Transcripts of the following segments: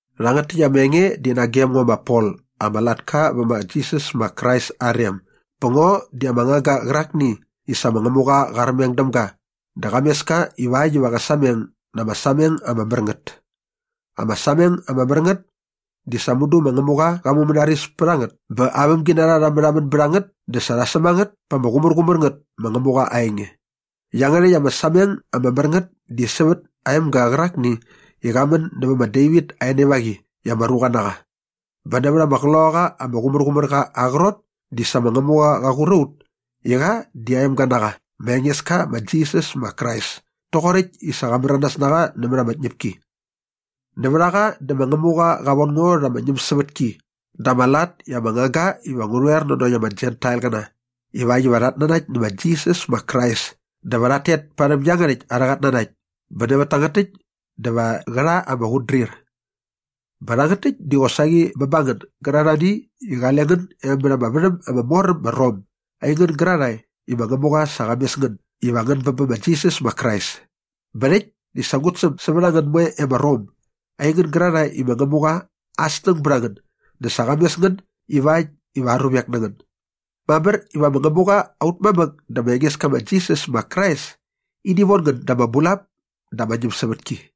Rhangät täkt ama enge di nagem ngo ma Pol ama latka vä ma Jisas ma Krais aa rem bä ngo di ama ngangga qärakni i sa ma Ngämuqa qa armeng däm ga dä qa mes ka ivakt iva qä sameng na aa sameng ama mär ngät. Ama sameng ama mär ngät di sa mudu ma Ngämuqa qa mumänaris pät a ngät bä aa vämginarha rha märhamän bät a ngät dä sa rha säm a ngät pa ama qumärqumär ngät ma Ngämuqa aa enge. Iangärhäkt ama sameng ama mär ngät di sävät aa emga qärakni i qa män nävät ma Devit aa enevaqi i ama ruqa na qa bä nävät ama Qloqaqa ama Qumärqumärqa aa qrot di sa ma Ngämuqa qa qur a ut i qa di aa emga na qa ma Engeska ma Jisas ma Krais toqoräkt i sa qa märanas na qa nämät ama tñäpki. Nävät a qa dä ma Ngämuqa qa von ngo rha ama ñämsävätki dä ama lat i ama ngangga iva ngu rhoer nanokt ama Jentailqäna ivakt iva rhat nanakt nä ma Jisas ma Krais dä va rhat tet parhäm iangärhäkt arhä qatnanakt bä nävät tangät täkt dä va qä rha ama qutdrir. Bä rhangät täkt di qosaqi bä ba ngän gärarhani i qale ngän e mät ama värhäm ama mor äm ma Rom aingän gärarhae i ma Ngämuqa sa qa mes ngän iva ngän bä bä ma Jisas ma Krais. Bä rhäkt di sa ngut säm sävät a ngän moe e ma Rom aingän gärarhae i ma Ngämuqa aa snäng bät a ngän dä sa qa mes ngän ivakt iva aa ruvek na ngän. Mamär iva ma Ngämuqa aut mamäk dä ma Engeska ma Jisas ma Krais ini von ngän da ama bulap dä ama ñämsävätki.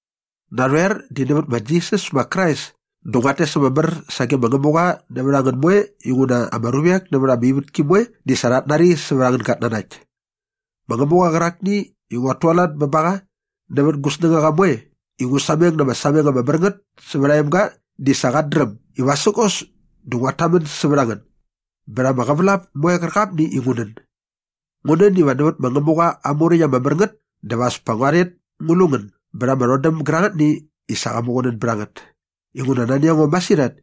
Narhoer di nävät ma Jisas ma Krais dä nguat tes ama mär sage ma Ngämuqa nävät a ngän moe inguna ama ruvek nävät ama ivätki moe di sa rhat nari sävät angän gatnanakt. Ma Ngämuqa qärakni i nguat tualat bä ba qa nävät gu snängaqa moe i ngu sameng na ama sameng ama mär ngät sävät aa emga di sa qat dräm i vasägos dä nguat tamän sävät a ngän bät ama qävälap moe qärqapni i ngu nän. Ngu nän iva nävät ma Ngämuqa aa Muräkt ama mär ngät dä va as pa ngua rhet ngu lu ngän bät ama rhodäm gärangätni i sa qa muqunän bät a ngät. Inguna nani a ngo masirhat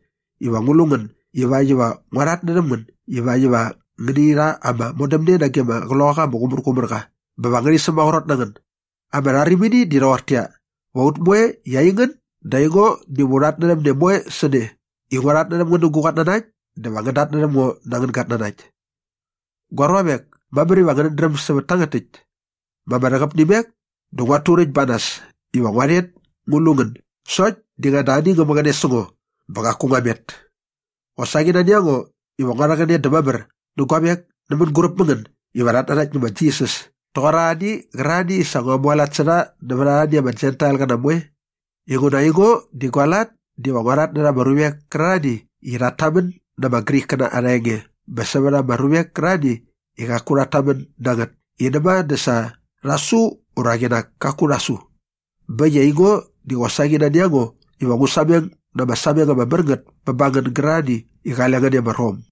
iva ngu lu ngän ivakt iva ngua rhatnärhäm ngän ivakt iva ngäni rha ama modämne nage ama Qloqaqa ama Qumärqumärqa bä va ngärhi sämaqrot na ngän. Ama rharimini di rhoqortäqyia, va ut moe i aingän dä aingo diva u rhatnärhäm ne moe sä ne i ngua rhatnärhäm ngän nä gu qatnanakt dä va ngän datnärhäm ngo na angän gatnanakt. Gua ruavek, mamär iva ngänät dräm sävät tangät täkt. Ma ama rhäqäp nä imek dä nguat turäkt ba nas iva ngua rhet ngu lu ngän sokt di ngäda ani ngä mäqäne sä ngo bä qaku ngua met. Qosaqi nani a ngo iva ngua rhäqäne dä mamär nä guavek nä mänguräp mä ngän iva rhat nanakt nä ma Jisas toqor arhani qärarhani i sa ngua mualat sä rha nävät arhani ama Jentailqäna moe. Inguna aingo di gua lat diva ngua rhatnärha ama ruvek kärarhani i rhat tamän na ama Grikkäna arha enge bä sävät ama ruvek kärarhani i qaku rhat tamän na ngät i näma dä sa rha su ura qinak kaku rha su. Bä äkt i aingo di qosaqi nani a ngo iva ngu sameng na ama sameng ama mär ngät bä ba ngän gärarhani i qale ngän e ma Rom.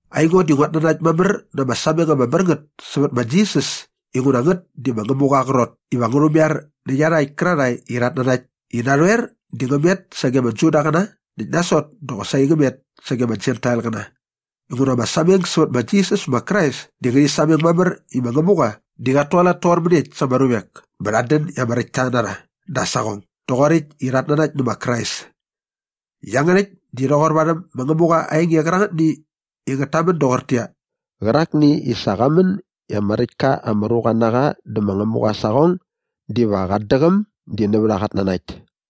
Aingo di nguat nanakt mamär na ama sameng ama mär ngät sävät ma Jisas inguna ngät di ma Ngämuqa aa qrot iva ngä rhumaiar nä iarhakt kärarhae i rhat nanakt i narhoer di ngä met sage ama Judaqäna näkt nasot dä qosaqi ngä met sage ama Jentailqäna. Inguna ama sameng sävät ma Jisas ma Krais di ngärhi sameng mamär i ma Ngämuqa di qat tualat toqor mäniekt sa ama ruvek bä rhat dän i ama räktta na rha da aa saqong doqoräkt i rhat nanakt nä ma Krais. Iangärhäkt di rhoqor varhäm ma Ngämuqa aa enge qärangätni i ngät tamän doqortäqyia, “Qärakni i sa qa män i ama räktka ama ruqa na qa dä ma Ngämuqa aa saqong diva qat däqäm di nävät aa qatnanakt.”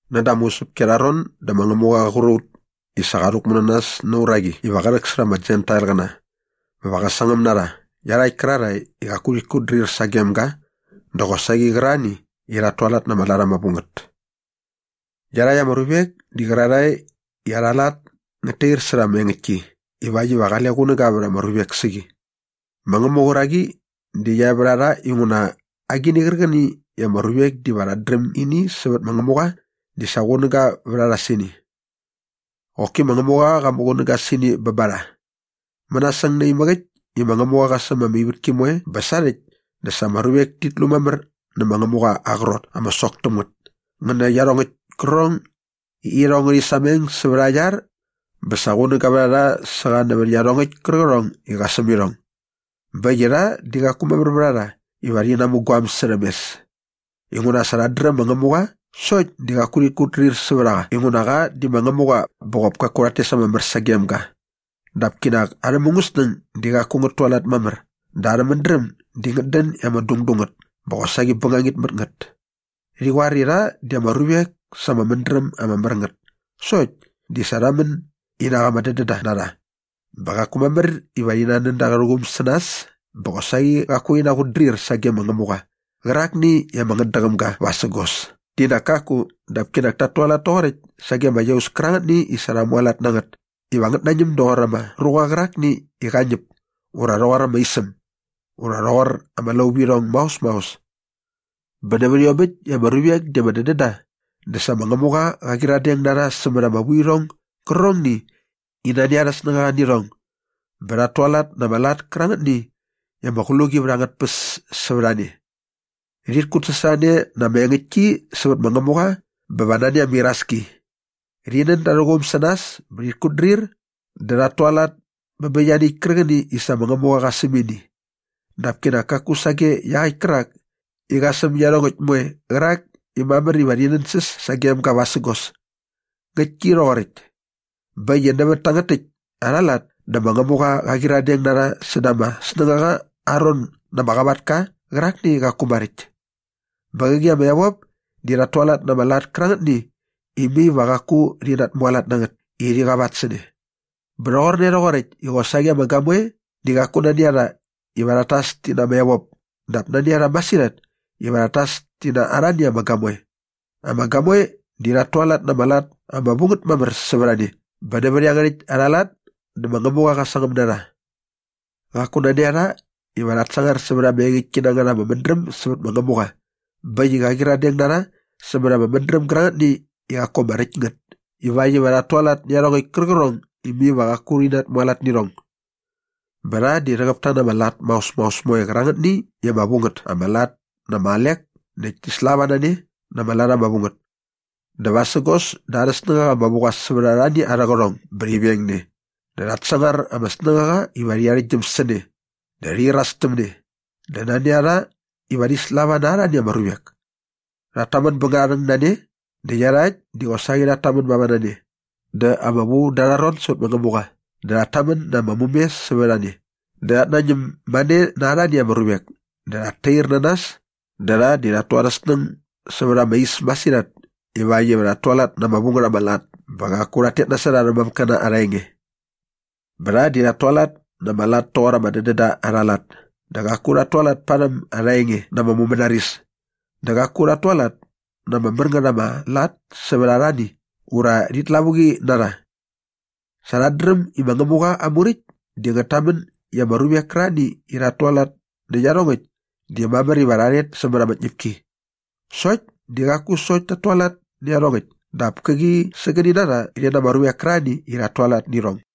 Näda ama usäpki arha ron dä ma Ngämuqa qär qur a ut i sa qa rhäkmu na nas na aa uraqi iva qä rhäksärha ama Jentailqäna bä va qä sangäm na rha iarhakt kärarhae i qaku rhit kutdrir sagem ga dä qosaqi qärarhani i rhat tualat na ama lat ama vu ngät. Iarhakt ama ruvek di qärarhae i arha lat di ngät tair särha ama engäktki ivakt iva qale qunäga vät ama ruvek sä qi. Ma Ngämuqa aa uraqi di qia e vät a rha inguna agini qärqäni i ama ruvek diva rhat dräm ini sävät ma Ngämuqa di sa qunäga vät a rha sä ini. Qoki ma Ngämuqa qa muqunäga sä ini bä ba rha. Mänasäng naimäk äkt i ma Ngämuqa qa säm ama ivätki moe bä sarhäkt dä sa ama ruvek tit lu mamär nä ma Ngämuqa aa qrot ama sok täm ngät ngä nä iarhongäkt kärqärhong i irhong ngärhi sameng sävät aa iar bä sa qunäga vät a rha sä qa nävät iarhongäkt kärqärhong i sa qa säm irhong. Bä äkt i rha di qaku mamär vät a rha iva rhi namu guaäm särhäm mes. Inguna sa rhat dräm ma Ngämuqa sokt di qaku rhit kutdrir sävät a qa inguna qa di ma Ngämuqa bä qop pa rhat tes ama mär sagem ga. Dap kinak arhä mungäsnäng di qaku ngät tualat mamär dä arhä mädräm di ngät dän i ama dungdung ngät bä qosaqi bängangit mät ngät. Rhi qoar i rha di ama ruvek sa ama mädräm ama mär ngät sokt di sa rha män i nak ama dädända na rha bä qaku mamär iva rhi nan da arhä quum sä nas bä qosaqi qaku rhi naqutdrir sage ma Ngämuqa qärakni i ama ngätdäqäm ga vasägos di nak kaku dap kinak tat tualat toqoräkt sage ama iaus kärangätni i sa rha mualat na ngät iva ngät nañäm doqor ama ruqa qärakni iva qä ñäp ura rhoqor ama isäm ura rhoqor ama lauvirhong maos maos. Bä nävät iomäkt i ama ruvek di ama dädän da dä sa ma Ngämuqa qa qyiradeng na rha sämät ama vuirhong gärqärhongni i nani arhä snängaqa nä irhong bä rhat tualat na ama lat kärangätni i ama qluqi vät angät tpäs sävät a ne. Rhit kutsasorhane na ama engäktki sävät ma Ngämuqa bä va nani ama iraski. Rhi nän da arhä quum sä nas bä rhit kutdrir dä rhat tualat bä bä ianiäkt kärqäni i sa ma Ngämuqa qa säm ini dap kinak kaku sage iaqäkt kärak i qa säm iarhongäkt moe qärak i mamär iva rhi nänsäs sagem ga vasägos. Ngäktki rhoqoräkt. Bä äkt i nävät tangät täkt arha lat dä ma Ngämuqa qa qyiradeng na rha säda ama snängaqa aa ron na ama qavatka qärakni i qaku maräkt. Bä qäqi ama evop di rhat tualat na ama lat kärangätni i mai va qaku rhi natmualat na ngät i rhi qavat sä ne. Bä rhoqorne rhoqoräkt i qosaqi ama gamoe di qaku nani a rha iva rhat tas ti na ama evop dap nani a rha masirhat iva rhat tas ti na arhani ama gamoe. Ama gamoe di rhat tualat na ama lat ama vu ngät mamär sävät a ne bä nävät iangärhäkt arha lat dä ma Ngämuqa qä sangäm na rha. Qaku nani a rha iva rhat sangar sävät ama engäktki na ngät ama mädräm sävät ma Ngämuqa bä äkt i qa qyiradeng na rha sämät ama mädräm gärangätni i qaku ama räkt ngät ivakt iva rhat tualat nä iarhongäkt kärqärhong i mai va qaku rhi natmualat nä irhong. Bä rha di rhäqäp ta na ama lat maos maos moe qärangätni i ama vu ngät ama lat dä ama alek näkt ti slava na ne na ama lat ama vu ngät. Dä vasägos dä arhä snängaqa ama vu qa sävät arhani arhä qärhong bä rhi veng ne dä rhat sangar ama snängaqa iva rhi arhäktgyäm sä ne dä rhi iras täm ne dä nani a rha iva rhi slava na arhani ama ruvek. Rhat tamän bä ngärharhäng na ne näkt iarhakt di qosaqi rhat tamän mava na ne dä ama vu da arha ron sävät ma Ngämuqa dä rhat tamän na ama mume sävät a ne dä rhat nañäm mane na arhani ama ruvek dä rhat tair na nas dä rha di rhat tu arhä snäng sävät ama is masirhat ivakt iva rhat tualat na ama vu ngät ama lat bä qaku rhat tet nasot arhä mamäkkäna arha enge. Bä rha di rhat tualat na ama lat toqor ama dädända arha lat dä qaku rhat tualat parhäm arha enge na ama mumänaris dä qaku rhat tualat na ama mär ngät ama lat sävät arhani ura rhit lavuqi na rha. Sa rhat dräm i ma Ngämuqa aa Muräkt di ngät tamän i ama ruvek kärarhani i rhat tualat nä iarhongäkt di mamär iva rha rhet sämät ama tñäpki. Sokt di qaku sokt tat tualat nä iarhongäkt dap käqi sägäni na rha rhi na ama ruvek kärarhani i rhat tualat nä irhong.